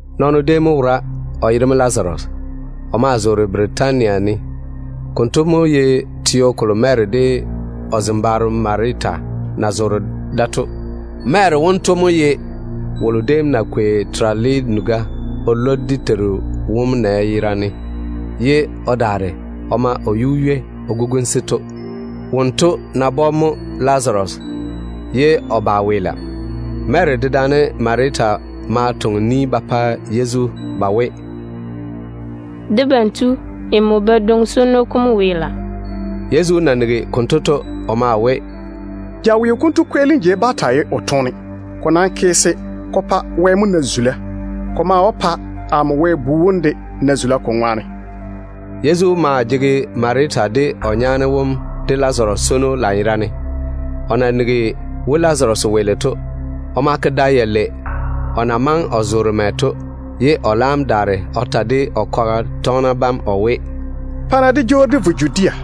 Nɔɔno déem mo wora, o yere mo Lazaru. O maa zoore Bɛtania ne. Konto mo ye teo kolo Mary de o zembaaro Marita na zoore da to. Mary wonto mo ye wolo déem na kwei terale nuga o lwo dé Teiru wom nɛ yera ne, ye o daare o ma o yu-ywei o guguni-se to. Wonto nabɔ mo Lazaru, ye o ba o weela. Mary dedaane Marita ma toŋe ni ba pa Yezu ba we, “Debam Tu, nmo badwoŋ-swono kom weela.” Yezu na nigi konto to, o maa we, “Jaweo konto kweelim jei bá taa ye o toone. Ko nam ke se ko pa Wɛ mo na zula. Ko maa wó pa amo Wɛ Bu wom de na zula ko ŋwaane.” Yezu maa jege Marita de o nyaane wom de Lazaru swono lanyerane. O na nigi we Lazaru weele to, o ma ke da yalei o na maŋe o zoore mɛ to, ye o laam daare o ta de o kwaga tɔgena bam o we, “Pa-na dé jwoori dé vo Judea.”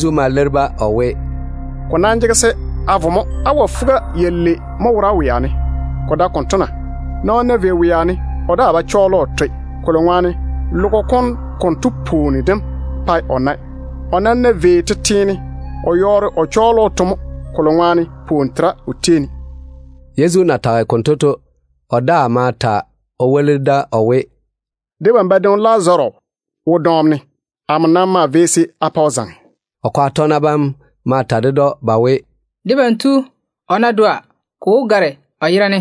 Yezu ma leiri-ba o we, “Ko nam jege se a vo mo. Awa fuga-yalei mo wora wea ne. Ko dae konto na? Nɔɔno ná vei wea ne, o daa ba tiri o toe, kolo ŋwaane logo kom konto pwooni dem pae o nae. O nam ná vei tete ne, o wó yɔɔre o taa tiri o toe mo, kolo ŋwaane pwooni tera o tei ne.” Yezu na tage konto to, o daa ma ta o woli da o we, “Debam badwoŋi Lazaru wo dɔɔm ne. Amo nam maa vei da se a pa o zaŋe mo.” O kwaga tɔgena bam ma ta ded‑o ba we, “Debam tu, o ná dɔa, ko wó gare o yera ne.”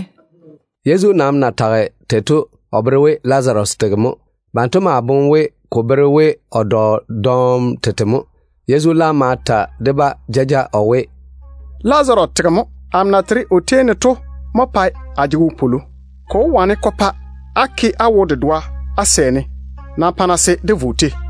Yezu nam na tage tei to, o bere we Lazaru tege mo. Banto maa boŋe we ko bere we o dɔ dɔɔm tete mo. Yezu laam ma ta de-ba jaja o we, “Lazaru tege mo. Amo na tere o tei ne to mo pae a jege wopwolo abam ŋwaane. Ko wó wane ko pa á ke á wo-dedoa á sɛ-ne. Nam pa-na se dé vo o tei.”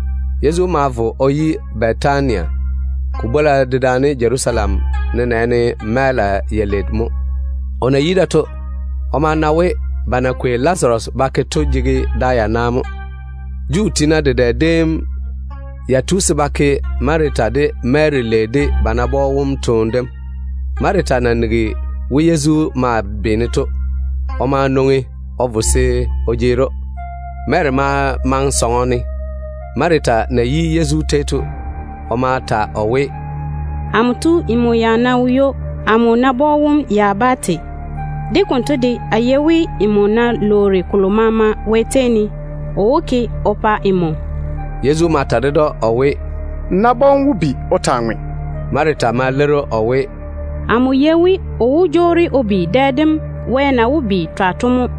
Yezu ma vo o yi Bɛtania. Ko bwola dedaane Jerusalem nenɛɛne mɛɛla yalei mo. O na yi da to, o ma na we ba na kwei Lazaru ba ke to jege da yana mo. Juu tiina dedɛ déem ya tu se ba ke Marita de Mary lei de ba nabɔ wom toone dem. Marita na nigi we Yezu maa beene to, o ma nwoŋi o vo se o jeeri‑o. Mary ma maŋe sɔŋɔ ne. Marita na yi Yezu tei to, o ma ta o we, “Amo tu, nmo ya ná wo ywo, amo nabɔ wom ya bá te. De konto de, a yei we nmo ná lwoori kolo maama Wɛ tei ne, o wó ke o pa nmo.” Yezu ma ta ded‑o o we, “N nabɔ wom wó bi o taa ŋwe.” Marita ma leiri‑o o we, “Amo yei we o wó jwoori o bi dɛ dem Wɛ na wó bi twa to mo.”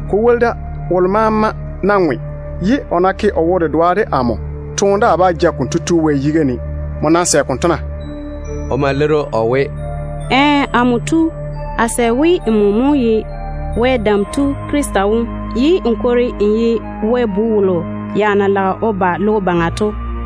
Ko woli da, wolo maama ná ŋwe, ye o ná ke o wo-dedoa de amo, toone daa bá ja konto tu Wɛ yiga ne. Nmo nam sɛ konto na?” O ma leiri‑o o we, “Ɛɛ. Amo tu, a sɛ we nmo mo ye Wɛ Dam Tu Krista wom, ye n kwori n ye Wɛ Bu wolo na jege se o ba logo baŋa to.”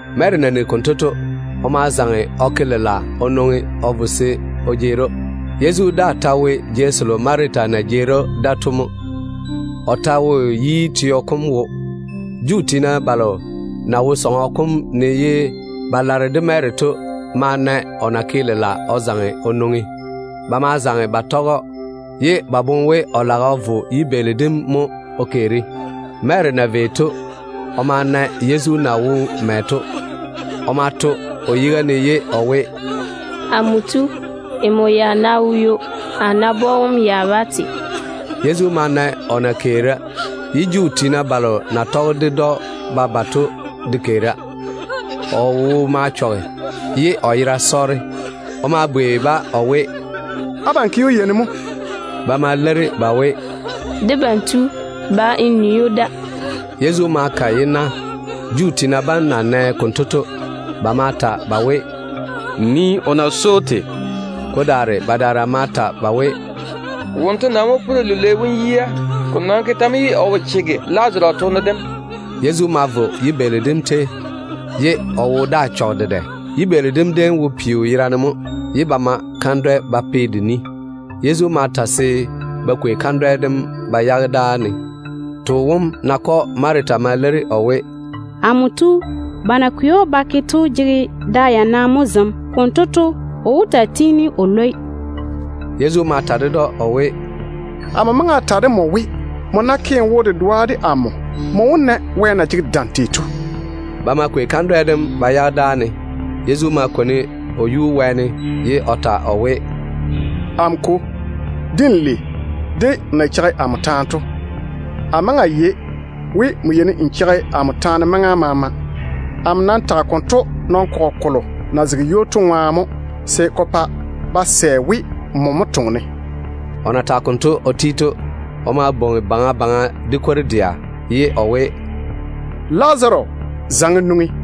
Mary na nigi konto to, o ma zaŋe o ke lela o nwoŋi o vo se o jeeri‑o. Yezu daa ta wo jei selo Marita na jeeri‑o da to mo. O ta wo yi teo kom wo. Juu tiina balo na wo sɔŋɔ kom ne ye ba lare de Mary se ko gane o boboŋa to ma na o na ke lela o zaŋe o nwoŋi. Ba ma zaŋe ba tɔge‑o, ye ba boŋe we o ga lage o vo yibeeli dem jeiga mo o keeri. Mary na vei o na Yezu na wo mɛ to, o ma to o yiga ne ye o we, “Amo tu, nmo ya ná wo ywo, a nabɔ wom ya bá te.” Yezu ma na o na keera, ye Juu tiina balo na tɔge ded‑o ba ba to de keera. O wo ma chɔge, ye o yera sɔɔre. O ma bwei-ba o we, “Abam ke‑o yei ne mo?” Ba ma leiri ba we, “Debam tu, ba n nii‑o da.” Yezu ma ka yi-na. Juu tiina bam na nɛ konto to, ba ma ta ba we, “Nii o na swoi‑o tei.” Ko daare badaara ma ta ba we, “Wonto nam mo puri lilwei wom yia. Ko nam ke tɛ mo ye o wo chege Lazaru toone dem?” Yezu ma vo yibeeli dem ni, ye o wo daa chɔge dedɛ. Yibeeli dem déem wo peo yera ne mo, ye ba ma kandwɛ-kamunu ba pe de ni. Yezu ma ta se ba bibili kandwɛ dem ba yage dáa ne. Too wom nakɔ Marita ma leiri o we, “Amo tu, ba na kwei‑o ba ke to jege da yana mo zem. Konto to, o wó taa tiini o lwoi.” Yezu ma ta ded‑o o we, “A maŋe a ta de nmo we, nmo ná ke n wo-dedoa de amo, nmo wó na Wɛ na jege dam tei to.” Ba ma kwei kandwɛ dem ba yage dáa ne. Yezu ma kwoni o yuu wɛɛne, ye o ta o we, “Amo Kwo, de n lei de nmo na cheigi amo taane to. A maŋe a yei we nmo yeini n cheigi amo taane maŋa maama. Nɔn-kɔgɔ kolo na zege ywo to ŋwaane mo amo nam tage konto, se ko pa ba sɛ we nmo mo toŋe-ne.” O na tage konto o ti to, o ma bwoŋi baŋa baŋa de kwor-dɛa ye o we, “Lazaru, zaŋe n nwoŋi!”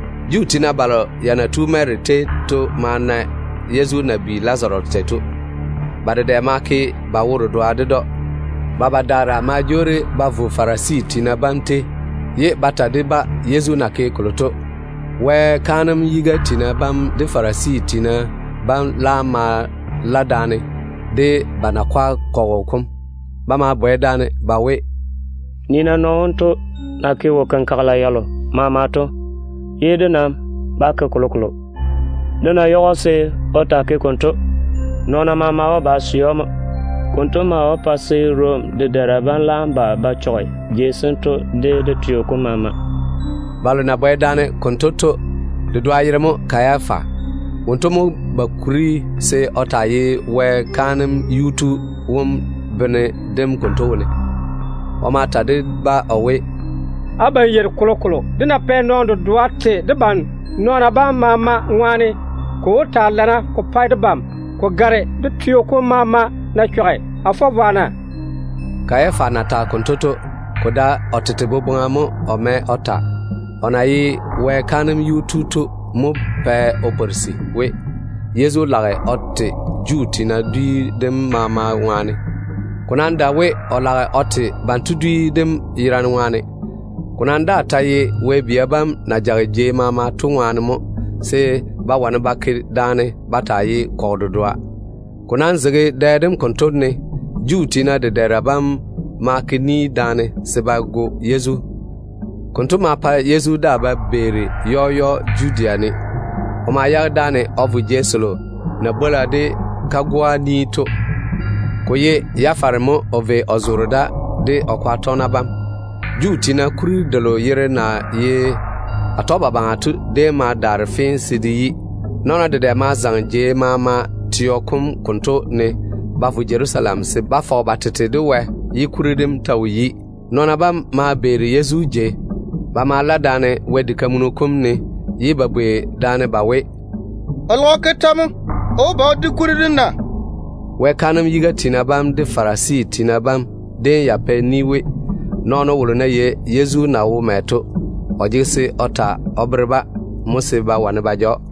Juu tiina balo ya na tu Mary tei to ma na Yezu na bi Lazaru tei to. Ba dedɛ ma ke ba wo-dedoa ded‑o. Ba badaara ma jwoori ba vo Farisi tiina bam tei, ye ba daare ba ta de-ba Yezu na ke kolo to. Wɛ kaanem yiga tiina bam de Farisi tiina bam laam ma la daane de ba nakwa kɔgɔ kom. Ba ma bwɛ daane ba we, “Nii-na nɔɔno wonto na ke wo-kenkagela yalo maama, ye dé nam ba ke kolokolo. Dé ná yage‑o se o taa ke konto, nɔɔna maama wó ba ba sɛ‑o mo. Konto maa wó pa se Rom dedɛɛra bam laam ba ba chɔge wara-jei sento de dé teo kom maama.” Balo na bwɛ daane konto to dedoa yere mo Kayafa. Wonto mo ba kuri se o taa ye ba kaanem yuu tu wom bene dem konto wone. O ma ta de-ba o we, “Abam yeiri kolokolo. Dé ná pɛ nɔɔno dedoa te debam nɔɔna bam maama ŋwaane, ko wó taa lana ko pa debam ko gare dé teo kom maama ná chɔge. A fɔ vwa na?” Kayafa na tage konto to, ko dae o tete boboŋa mo o mɛ o ta. O nam na ye Wɛ kaanem yuu tu to mo pɛ o pworisi we, Yezu lage o te Juu tiina dwi dem maama ŋwaane mo. Ko nam dae we o lage o te banto dwi dem yerane ŋwaane. Ko nam daa ta ye Wɛ bia bam na jage jei maama to de ŋwaane mo, se ba wane ba ke daane ba taa ye kɔgɔ dedoa. Ko nam zege dɛ dem konto ne to, Juu tiina dedɛɛra bam maa lage chwoŋa se ba go Yezu. Konto ma pa Yezu daa ba beeri jaja Judea ne. O ma yage dáane o vo jei selo na bwola de kagoa ni to. Ko ye Efrayim ne mo o vei o zoore da de o kwaga tɔgena bam. Juu tiina kuri delo yere na ye Atɔgebabaŋa to déem ma daare fee se de yi. Nɔɔna dedɛ ma zaŋe teo kom jei maama ne ba vo Jerusalem se ba fɔge ba tete de Wɛ ye kuri dem ta wo yi. Nɔɔna bam ma beeri Yezu jei. Ba ma la daane Wɛ diga kam ne, ye ba bwei daane ba we, “O lage o ke tɛ mo? O wó ba o di kuri dem na?” Wɛ kaanem yiga tiina bam de Farisi tiina bam déem ya pɛ ni we, nɔɔno wolo ná yei Yezu na wo mɛ to, o jege se o ta o bere-ba mo se ba wane ba ja‑o.